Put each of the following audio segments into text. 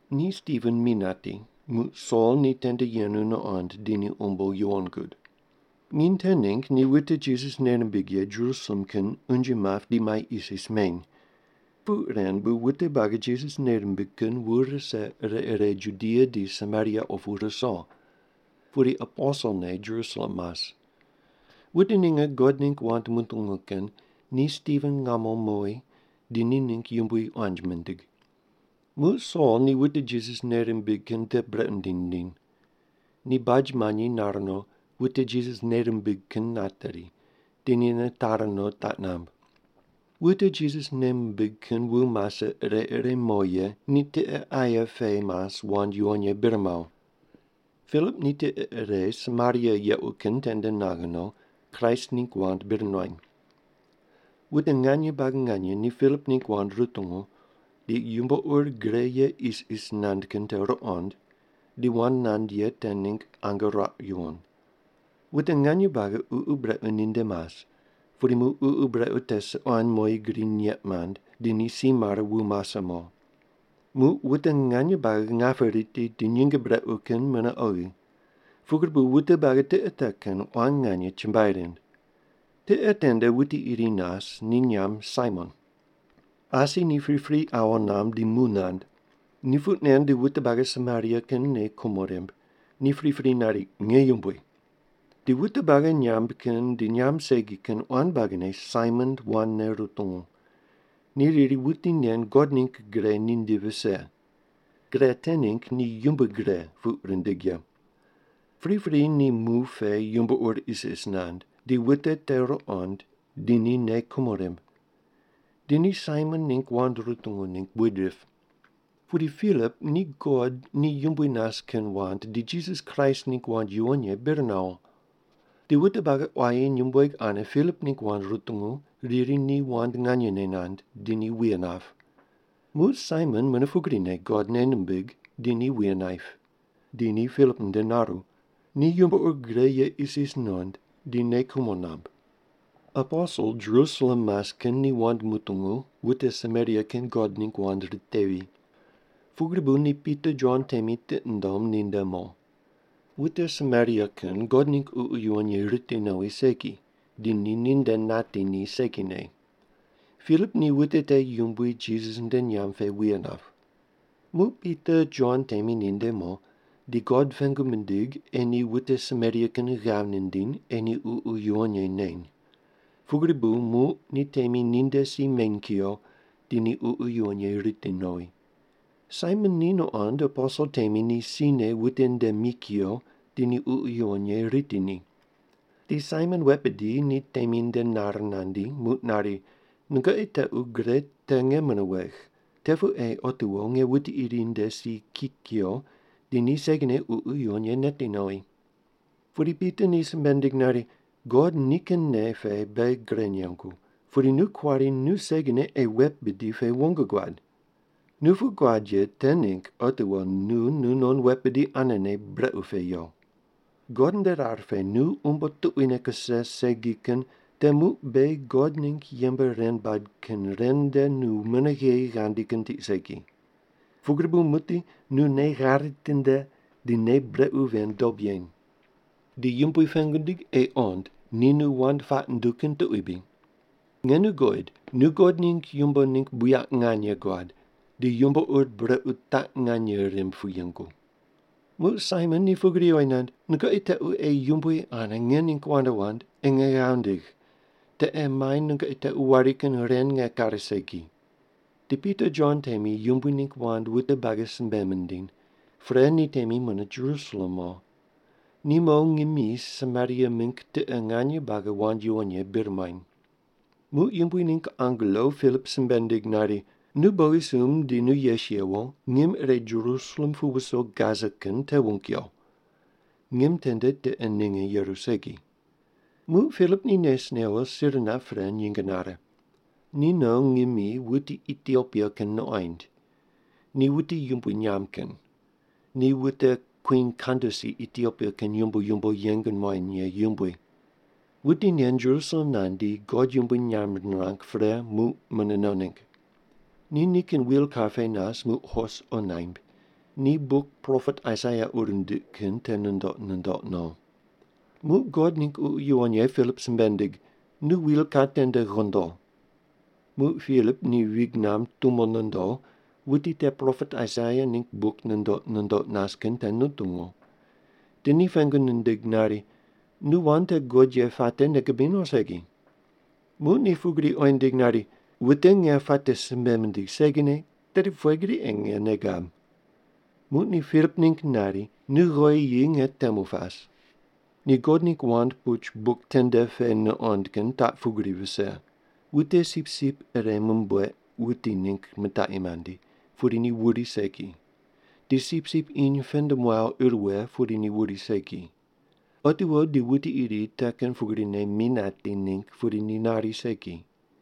Ni Stiven mi nati, muq Sol ni tende yenu nuqond di ni umbo yuwon gud. Nginy te ningg ni wute Jisas nei rimbig ye Jerusalem kin unje map di mai isis meny. Puq ren bu wute buagi Jisas nei rimbig kin wu rise ire ire Judia di Samaria opu ruso. Pudi aposel ne Jerusalem mas. Wute ninge God ningg wand mutungu kin ni Stiven ngamo mowi di ni ningg yumbui quanji mindig. Muq Sol ni wute Jisas nei rimbig kin brequ nindiny nindiny. Ni baj manyi nar no, wute Jisas nei rimbig kin nateri. Di ni nitari no, taq namb. Wute Jisas nei mimbig kin wu mase ire ire mo ye ni tiqe aye pe mas wand yuwon ye bir mawo. Pilip ni tiqe ire Samaria yequ kin tende naghe no, Kraist ningg wand bir nuany. Wute nganye buagi nganye ni Pilip ningg wand rutungu, di yumbo ur gre ye isis nand kin te ruqond, di wand nand ye te ningg ange ruaq yuwon. Wute nganye buagi ququ brequ ninde mas, pudi muq ququ brequ te suquan moyi gri nyeq mand, di ni si mare wu mase mo. Muq wute nganye buagi ngape riti di nyinge brequ kin mune oghi. Pugri bu wute buagi tiqe te kin quan nganye chumbuai rind. Tiqe tende wuti iri nas, ni nyamb Saimon. Asi ni pripri awo namb di mu nand. Ni puq nen di wute buagi Samaria kin nei kumo rimb. Ni pripri nari, “Nge yumbui.” Di wute buagi nyamb kin di nyamb segi kin quan buagine Saimon wandne rutungu. Ni riri, “Wuti nen God ningg gre ninde vise.” Gre te ningg ni Yumbui Gre puq rindig ye. Pripri ni mu pe yumbo ur isis nand, di wute te ruqond, di ni nei kumo rimb. Di ni Saimon ningg wand rutungu ningg buid rip. Pudi Pilip ni God ni yumbui nas kin wand di Jisas Kraist ningg wand yuwon ye bir nawo. Di wute buagi quayi nyumbueg ane Pilip ningg wand rutungu riri ni wand nganyene nand, di ni wuye nap. Muq Saimon mune pugrine God nei nimbig di ni wuye naip. Di ni Pilip nde naru. Ni yumbo ur gre ye isis nuqond, di nei kumo namb. Aposel Jerusalem mas kin ni wand mutungu wute Samaria kin God ningg wand ritevi. Pugri bu ni Pita Jon temi tiqi mundom ninde mo. Wute Samaria kin God ningg Ququ Yuwon Ye riti nowi segi, di ni ninde nati ni segine. Pilip ni wute te Yumbui Jisas nde nyamb pe wuye nap. Muq Pita Jon temi ninde mo, di God pengu mindig ei ni wute Samaria kin ghav nindiny ei ni Ququ Yuwon Ye neny. Pugri bu muq ni temi ninde si meny kuyo, di ni Ququ Yuwon Ye riti nowi. Saimon ni nuqond aposel temi te sine wute nde mi kuyo di ni Ququ Yuwon Ye riti ni. Di Saimon wet bidi ni temi nde nare nandi, muq nari, “Nungoqi tequ gre te nge mune wegh. Te pu ei otiwo nge wuti iri nde si ki kuyo, di ni segine Ququ Yuwon Ye neti nowi.” Pudi Pita ni simbe nindig nari, “God nikin nei pe beghi gre nengu, pudi nu kuari nu segine ei wet bidi pe wong guad! Nu puq guad ye te ningg otiwo nu nunon wet bidi anene brequ pe yo! God nde rar pe nu umbo tuquine kuse segi kin te muq beghi God ningg yembe ren bad kin ren nde nu mune gheyi ghandi kin tiq segi. Pugri bu muqdi nu nei ghare tinde di nei brequ ven dob yeny. Di Yumbui pengu ndig ei qond ni nu wand puaq nunduw kin tuqui bri. Nge nu guqoid, nu God ningg yumbo ningg buyaq nganye guad, di yumbo ur brequ taq nganye rimb pu yengu.” Muq Saimon ni pugri oyi nand, “Nungoqi tequ ei Yumbui ane nge ningg wand wand, ei nge ghav nindigh. Te ei mai nungoqi tequ wari kin ren nge kare segi.” Di Pita Jon temi Yumbui ningg wand wute buagi simbe mindiny. Pre ni temi mune Jerusalem mo. Ni mo ngimi Samaria mingg tiqe nganye buagi wand yuwon ye bir muany. Muq Yumbui ningg angelo Pilip simbe nindig nari, “Nu bogisumb di nu yes yewo, ngim ire Jerusalem pu wuso Gasa kin te wung yo.” Ngim tende tiqe ninge yeru segi. Muq Pilip ni nes newo sir nap pre, nyinge nare. Ni no ngimi wuti Itiopia kin nuqoind. Ni wuti yumbui nyamb kin. Ni wute Kwin Kandasi Itiopia kin yumbo yumbo yeng muany ye yumbui. Wuti nen Jerusalem nandi God yumbui nyamb nirang pre, muq mune no ningg. Ni nikin wilkar pe nas muq hos qo naimb. Ni buk propet Aisaia ur nindiq kin te nundoq nundoq no. Muq God ningg Ququ Yuwon Ye Pilip simbe nindig, “Nu wilkar tende ghondo.” Muq Pilip ni vig namb tumo nondo wuti te propet Aisaia ningg buk nundoq nundoq nas kin te nutungu. Di ni pengu nindig nari, “Nu wand te guqod ye puate nei gubiny o segi?” Muq ni pugri oyi nindig nari, “Wute nge puate simbe mindigh segine, tedi pughe gri ei nge nei gab?” Muq ni Pilip ningg nari, “Nu ghowi yi nge temu pas.” Ni God ningg wand puch buk tende pe nuqond kin taq pugri vise: “Wute sipsip ire mumbueq wuti ningg mitaqi mandi, pudi ni wuri segi. Di sipsip iny pend muaw ir wughe, pudi ni wuri segi. Otiwo di wuti iri te kin pugrine mi nati ningg pudi ni nari segi.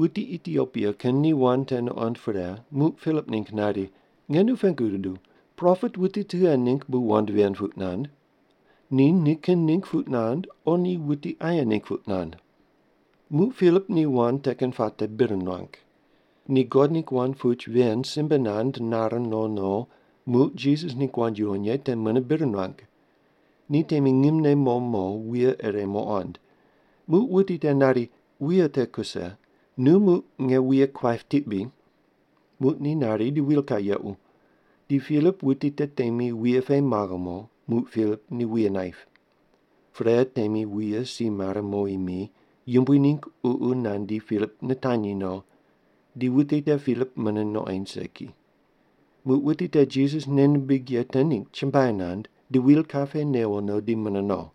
Wuti Itiopia kin ni wand te nuqond pre, muq Pilip ningg nari, “Nge nu pengu guduw, propet wuti tughe ningg bu wand ven puq nand? Ni nikin ningg puq nand, o ni wuti aye ningg puq nand?” Muq Pilip ni wand te kin puate bir nuang. Ni God ningg wand puch ven simbe nand nare no no, muq Jisas ningg wand yuwon ye te mune bir nuang. Ni temi ngimne mo mo, wuye ire muqond. Muq wuti te nari, “Wuye te kuse. Nu muq nge wuye kuaip tiq bri?” Muq ni nari di wilkar yequ. Di Pilip wuti te temi wuye pe maghe mo. Muq Pilip ni wuye naip. Pre, temi wuye si mare mowi mi, Yumbui ningg Ququ nandi, Pilip nitanyi no. Di wuti te Pilip mune nuqoind segi. Muq wuti te Jisas nei nimbig ye te ningg chumbuai nand, di wilkar pe newo no, di mune no.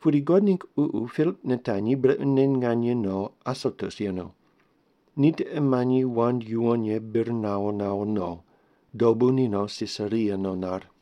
Pudi God ningg Ququ Pilip nitanyi brequne nganye no Asotus yenu. Ni tiqe manyi wand yuwon ye bir nawo nawo no. Dobu ni no Sisaria no nar.